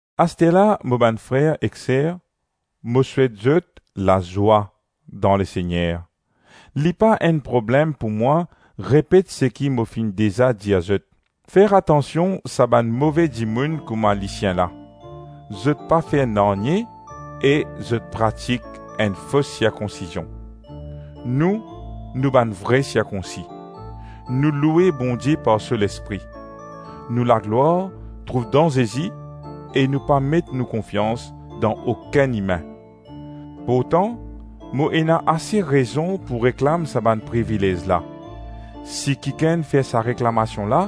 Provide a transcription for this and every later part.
Asterla mo bann frer ek ser, mo souet zot lazwa dan Lesegner. Li pa enn problem pou mwa repet seki mo finn deza dir zot, fer atansion sa bann move dimoun kouma lisien la, zot pa fer nanye e zot pratik enn fos sirkonsizion. Nou, nou bann vre sirkonsi. Nou loue Bondie par so Lespri. Nou laglwar trouv dan Zezi e nou pa met nou konfians dan okenn imin. Pourtan mo ena ase rezon pou reklam sa bann privilez la. Si kikenn fer sa reklamasion la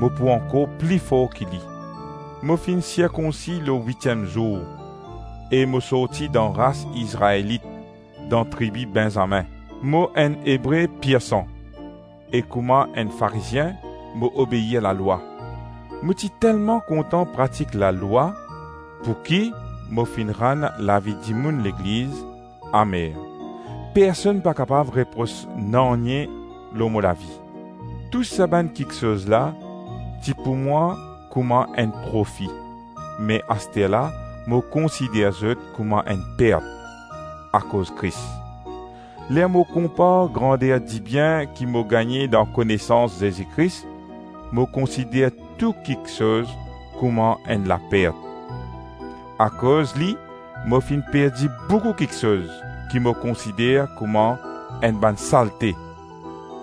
mo pou ankor pli for ki li. Mo finn sirkonsi lor witiem zour, e mo sorti dan ras Izraelit, dan tribi Benzamin. Mo enn Ebre pirsan e kouma enn Farizien, mo obeir lalwa. Mo ti telman kontan pratik lalwa pouki mo finn rann lavi dimoun legliz amer. Personn pa kapav repros nanye lor mo lavi. Tou sa bann kiksoz la ti pou mwa kouma enn profi, me asterla mo konsider zot kouma enn pert akoz Kris. Ler mo konpar grander dibien ki mo gagne dan konesans Zezi Kris, mo konsider tou kiksoz kouma enn lapert. Akoz li mo finn perdi boukou kiksoz ki mo konsider kouma enn bann salte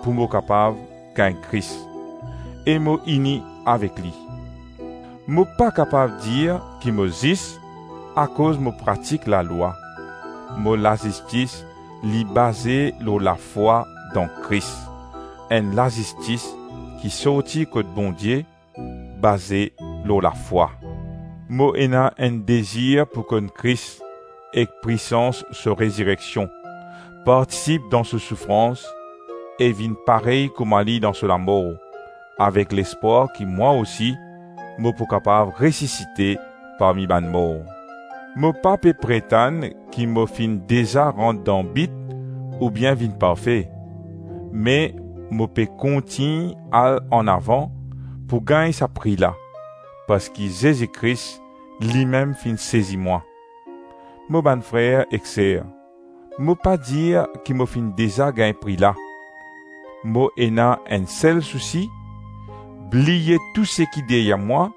pou mo kapav gagn Kris, e mo ini avek li. Mo pa kapav dir ki mo zis akoz mo pratik lalwa. Mo lazistis li baze lor lafwa dan Kris, enn lazistis ki sorti kot Bondie, baze lor lafwa. Mo ena enn dezir pou konn Kris ek pwisans so rezireksion, partisip dan so soufrans, e vinn parey kouma li dan so lamor, avek lespwar ki mwa osi mo pou kapav resisite parmi bann mor. Mo pa pe pretann ki mo finn deza rant dan bit oubien vinn parfe. Me mo pe kontign al anavan pou gagn sa pri la, parski Zezi Kris limem finn sezi mwa. Mo bann frer ek ser, mo pa dir ki mo finn deza gagn pri la; mo ena enn sel sousi: bliye tou seki deryer mwa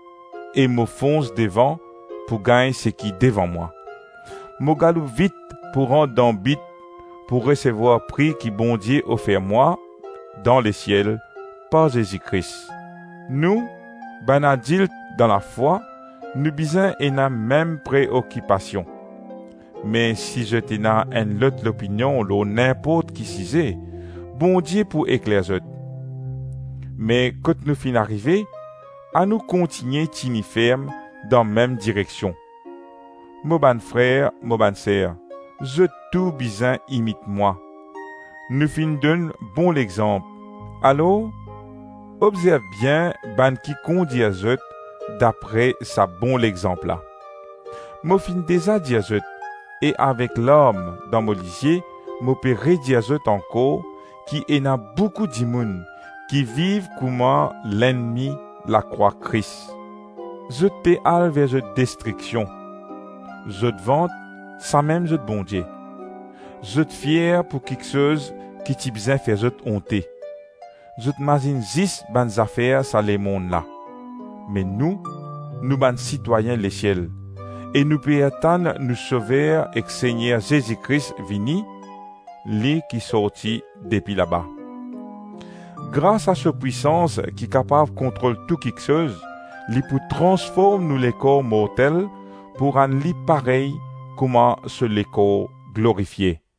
e mo fons devan pou gagn seki devan mwa. Mo galoup vit pou rant dan bit pou resevwar pri ki Bondie ofer mwa dan lesiel par Zezi Kris. Nou, bann adilt dan lafwa, nou bizin ena mem preokipasion. Me si zot ena enn lot lopinion lor ninport ki size, Bondie pou ekler zot. Me kot nou finn arive, anou kontigne tini ferm dan mem direksion. Mo bann frer, mo bann ser, zot tou bizin imit mwa. Nou finn donn bon lexanp, alor obzerv bien bann ki kondir zot dapre sa bon lexanp la. Mo finn deza dir zot e avek larm dan mo lizie mo pe redir zot ankor ki ena boukou dimoun ki viv kouma lennmi lakrwa Kris. Zot pe al ver zot destriksion; zot vant samem zot Bondie, zot fier pou kiksoz ki ti bizin fer zot onte; zot mazinn zis bann zafer sa lemonn la. Me nou, nou bann sitwayin lesiel e nou pe atann nou Sover ek Segner Zezi Kris vini, li ki sorti depi laba. Grasa so pwisans ki kapav kontrol tou kiksoz, li pou transform nou lekor mortel pou rann li parey kouma so lekor glorifie.